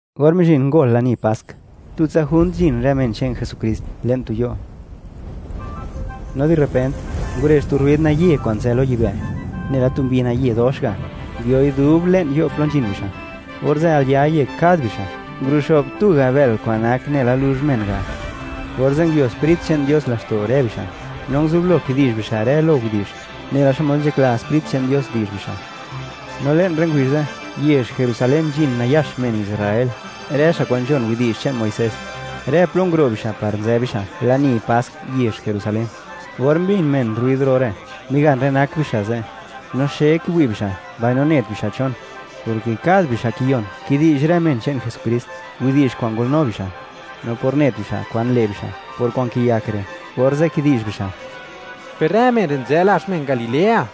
Or mizhin ngol lani Pask, tutsa junt nzhin rë men che'n Jesukrist le'n tu yo', no di repent, ngurezh tu rruid naye kwa'n nzë lo yibë', nela tu mbi naye dox ga', nguioi dub le'n yo' plo nzhin bixa'. Orze' al ya yek kad bixa', nguluxo'b tuga' bël kwa'n nak nela luzh men ga'. Orze' nguio Sprit che'n Dios laxto' rë bixa', no nguzublo kidi'zh bixa' rë lo widi'zh, nela xmod nzhakla Sprit che'n Dios, di'zh bixa'. No le'n rë ngubizh ze', yezh Jerusalén nzhin nayax men Israel, rë xa' kwa'n nzhon widi'zh che'n Muisés; rë plo nguro' bixa' par nzë bixa' lani Pask yezh Jerusalén. Or mbin men rruid ro re', migan rë nak bixa' ze'; no xe kiwi' bixa', mbaino net bixa' chon, porke kad bixa' kiyon kidi'zh rë men che'n Jesukrist widi'zh kwa'n ngolnu bixa'. No por net bixa' kwan le' bixa' por kwa'n kiyak re', orze' kidi'zh bixa': ―Per rë men re' nzë lazh men Galilea.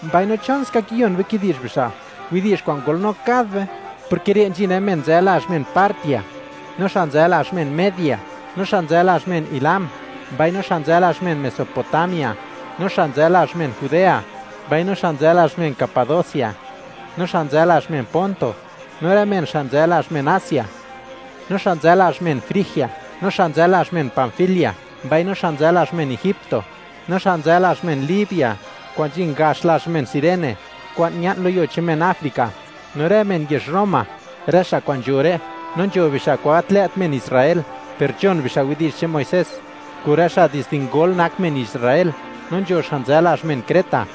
Mbaino, ¿chon ska kiyon be kidi'zh bixa' widi'zh kwa'n ngolnu kad be?, porke re' nzhin rë men nzë lazh men Partia, no xa' nzë lazh men Media, no xa' nzë lazh men Elam, mbaino xa' nzë lazh men Mesopotamia, no xa' nzë lazh men Judea, mbaino xa' nzë lazh men Capadocia, no xa' nzë lazh men Ponto, no rë men xa' nzë lazh men Asia; no xa' nzë lazh men Frigia, no xa' nzë lazh men Panfilia, mbaino xa' nzë lazh men Egipto, no xa' nzë lazh men Libia kwa'n nzhin gax lazh men Cirene, kwa'n ña'n lo yuo che'n men Africa; no rë men yezh Roma, rë xa' kwa'n nzho re'. No nzho bixa' kwa'n gat lë't men Israel per nzhon bixa' widi'zh che'n Muisés, kun rë xa' dizde ngol, nak men Israel. No nzho xa' nzë lazh men Creta,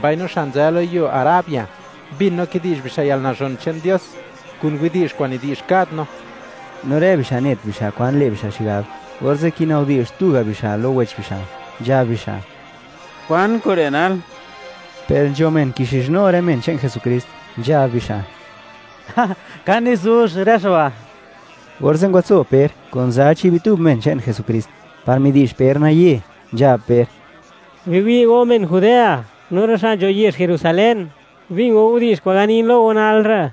mbaino xa' nzë lo yuo Arabia; mbin no kidi'zh bixa' yalnazhon che'n Dios kun widi'zh kwa'n nidi'zh kad no. No rë bixa' net bixa' kwan le' bixa' xigab, orze' kinabdi'zh tuga' bixa' lo wech bixa', nzhab bixa': ―¿Kwan kure' nal? Per nzho men kixizhnu rë men che'n Jesukrist, nzhab bixa': ―Ka nizuzh rë xa' ba'. Orze' ngwatso Per kun za chi' bitub men che'n Jesukrist, par midi'zh Per naye, nzhab Per: ―Biwi' go men Judea, no rë xa' nzho yezh Jerusalén; bin go widi'zh kwa'n ganin lo go nal re'.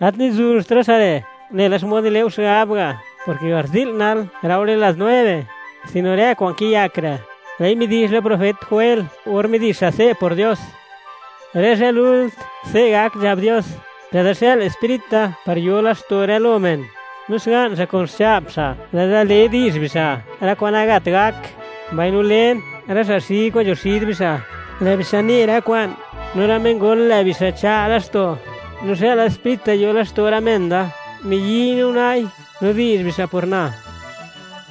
Gat nizuzht rë xa' re', nela xmod nile' go xigab ga', porke garzi'l nal, laore las nueve, sino ke rë kwa'n kiyak re', lë'i midi'zh la profet Joel, or midi'zh xa' se' por Dios: Rë zhë lult, se' gak, nzhab Dios, lë'da xë'l Sprit da, par yo laxto' rë lo men, no xga'n xa' kun xcha'p xa', lë'da le di'zh bixa', rë kwa'n nagat gak. Mbaino len, rë xa' xi kwa'n nzho xid bixa', lë' bixa' ne rë kwa'n, no rë men ngol, lë' bixa' cha' laxto'. No xëla Sprit da yo laxto' rë men da; miyi'y no una'i, no di'zh bixa' por na.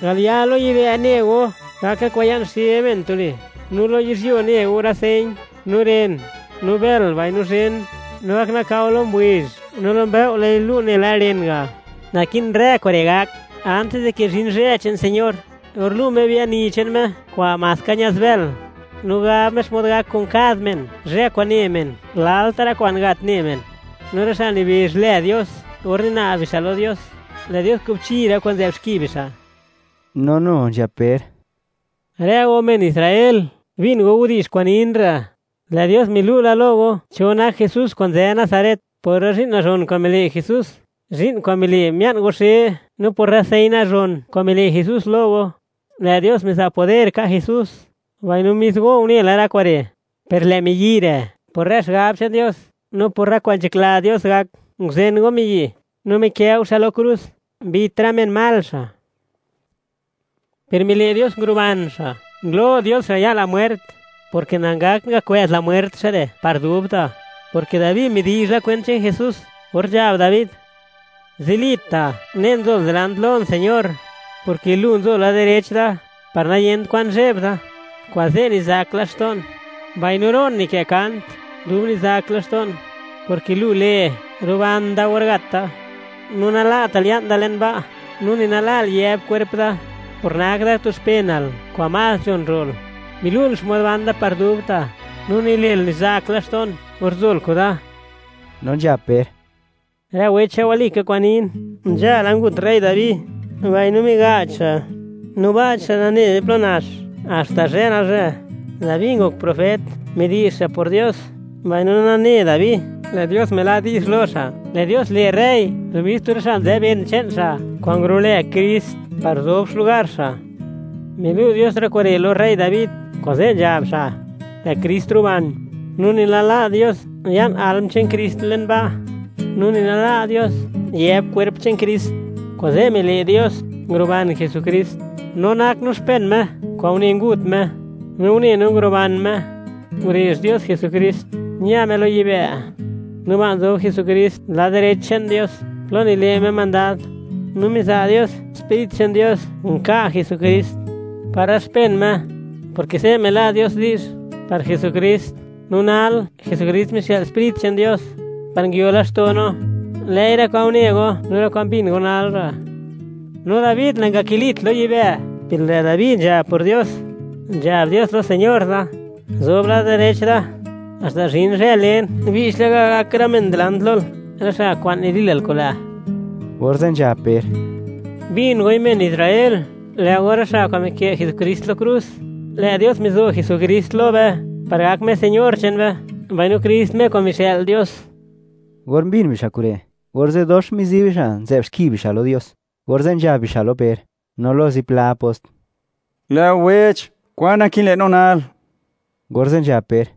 Al ya lo yibë' ne go, gak rë kwa'n ya'n xe men tuli, no lo yizhyuo ne go rë señ, no ren, no bël, mbaino zhen. No gak nakao lo ngubizh; no lo mbëo' lë'i lu' nela ren ga'. Naki'n rë kure' gak antis di ke zhin zhë che'n Señor, or lu' Me biani che'n Me kwa'n maska ña'zbël, no gab Me xmod gak kun kad men, zhë kwa'n ne men, lalta' rë kwa'n nagat ne men. No rë xa' nibezh lë Dios or nina'b bixa' lo Dios, lë' Dios kubchi rë kwa'n nzë'b xki bixa'. No nu nzhab Per: ―Rë go, men Israel; bin go widi'zh kwa'n nin re'. Lë' Dios milu' la lo go, cho nak Jesús kwa'n nzë Nazaret, por rë zhi'n nazhon kwa'n mile' Jesús, zhi'n kwa'n mile' mia'n go xe; no por rë señ nazhon kwa'n mile' Jesús lo go. Lë' Dios miza' poder ka' Jesús, mbaino mis go une la rë kure'. Per lë' miyi' re', por rë xigab che'n Dios, no por rë kwa'n nzhakla Dios gak, nguzen go miyi', no mikë' go xa' lo krus, mbit rë men mal xa'. Per mile' Dios nguruban xa', ngulo' Dios xa' ya' la mwert, porke nangakt ngakwë'z la mwert xa' re' par dubta', porke Dabi midi'zh la kwent che'n Jesús, or nzhab Dabi: Zilita' unen nzol dilant lon, Señor, porke Lu nzo lad direch da, par niyent kwan zheb da. Kuze', nizak laxto'n, mbaino ro'n nikë' kant dub nizak laxto'n, porke lu le', ruban da or gat da. No nala'tal ya'n da le'n ba', no ni nala'l yëb kwerp da, por nak da tu xpenal kwa'n más nzhon ro'l. Milu'l xmod ban da par dubta', no nile'l, nizak laxto'n, or nzol kuda. No nzhab Per: ―Lë' go wech, walika kwa'n nin; nzhala ngut rey Dabi, mbaino miga'ch xa', no ba' che'n xa' nane be plo nax, haxta zhë nalzhë. Dabi ngok profet, midi'zh xa' por Dios, mbaino nane Dabi, lë' Dios mila' di'zh lo xa', lë' Dios le' rey lo mis tu rë xa' nzë ben che'n xa' kwa'n ngurulë Krist, par zob xlugar xa'. Milu' Dios rë kure' lo rey Dabi, kuze' nzhab xa', lë' Krist ruban, no ni nala' Dios ya'n alm che'n Krist le'n ba', no ni nala' Dios, yëb kwerp che'n Krist. Kuze' mile' Dios, nguruban Jesukrist; no nak no men che'n Me kwa'n une ngut Me, no une no nguruban Me. Ngurezh Dios Jesukrist, ña Me lo yibë'. No ba' nzob Jesukrist lad direch che'n Dios, plo nile' Me mandad. No miza' Dios Sprit che'n Dios nka' Jesukrist par rë men che'n Me, porke se' mila' Dios di'zh par Jesukrist. No nal, Jesukrist mixë'l Sprit che'n Dios par nguio laxto' no, lë'i rë kwa'n une go, no rë kwa'n mbin go nal re'. No Dabi, nangakilit lo yibë', per lë' Dabi nzhab por Dios: Nzhab Dios lo Señor da: “Guzob lad direch da, haxta zhin zhë len, che'ptsa (bi'ch laka) gak rë men dilant lol, rë xa' kwa'n nidilal kun lë'.” Orze' nzhab Per: ―Bin goi, men Israel, lë' go rë xa' kwa'n mikë' Jesukrist lo krus. Lë' Dios mizo Jesukrist lo be, par gak Me Señor che'n be, mbaino Krist; Me kwa'n mixë'l Dios. Or mbin bixa' kure', orze' dox mizi bixa' nzë'b xki bixa' lo Dios, orze' nzhab bixa' lo Per, no lo zipla apost: ―¡Lë'o wech!, ¿kwan naki'n le' no nal? Orze' nzhab Per: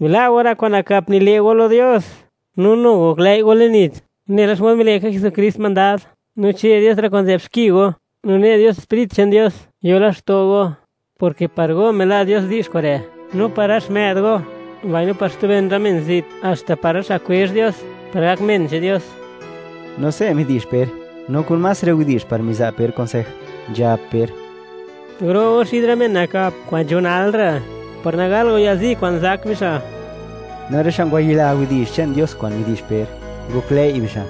―Bila' go rë kwa'n nakap nile' go lo Dios, no nu goklëi' go le'n nits nela xmod mile' ka Jesukrist mandad, no che' Dios rë kwa'n nzë'b xki go, no ne' Dios Sprit che'n Dios yo laxto' go, porke par go mila' Dios di'zh kure', no par rë xmë'd go, mbaino par xtu ben rë men zit, haxta par rë xa' kwezh Dios par gak men che'n Dios. No se' midi'zh Per, no kun más rë widi'zh, par miza' Per kunsej, nzhab Per: ―Guro' go xid rë men nakap kwa'n nzho nalre', par nagal go yalzi kwa'n zak bixa'. No rë xa' ngwayila widi'zh che'n Dios kwa'n midi'zh Per, ngoklëi' bixa'.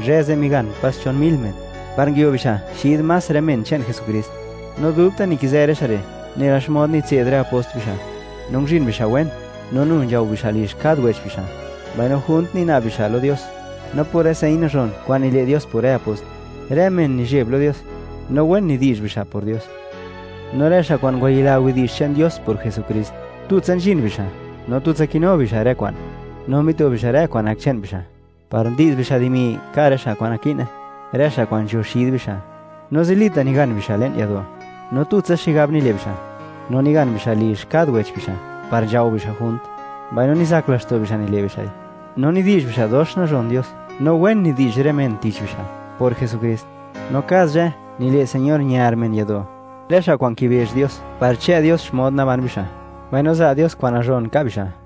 Zhë ze', migan pas chon mil men, par nguio bixa' xid más rë men che'n Jesukrist. No dubta', nikizë rë xa' re', nela xmod mitse'd rë apost bixa', no nguzhin bixa' wen, no nu nzhao bixa' lizh kad wech bixa', mbaino junt nina'b bixa' lo Dios. No por rë señ nazhon kwa'n nile' Dios por rë apost, rë men nizheb lo Dios, no wen nidi'zh bixa' por Dios. No rë xa' kwa'n ngwayila widi'zh che'n Dios por Jesukrist, tutsa nzhin bixa', no tutsa kinu bixa' rë kwa'n. No mito bixa' rë kwa'n nak che'n bixa', par ndi'z bixa' dimi, ka' rë xa' kwa'n naki'ne, rë xa' kwa'n nzho xid bixa'. No zilita' nigan bixa' le'n yado', no tutsa xigab nile' bixa'. No nigan bixa' lizh kad wech bixa' par nzhao bixa' junt, mbaino nizak laxto' bixa', nile' bixa'i. No nidi'zh bixa' dox nazhon Dios, no wen nidi'zh rë men tich bixa', por Jesukrist. No kad zhë nile' Señor ñar men yado', rë xa' kwa'n kibezh Dios par chë' Dios xmod naban bixa', mbaino za' Dios kwa'n nazhon ka' bixa'.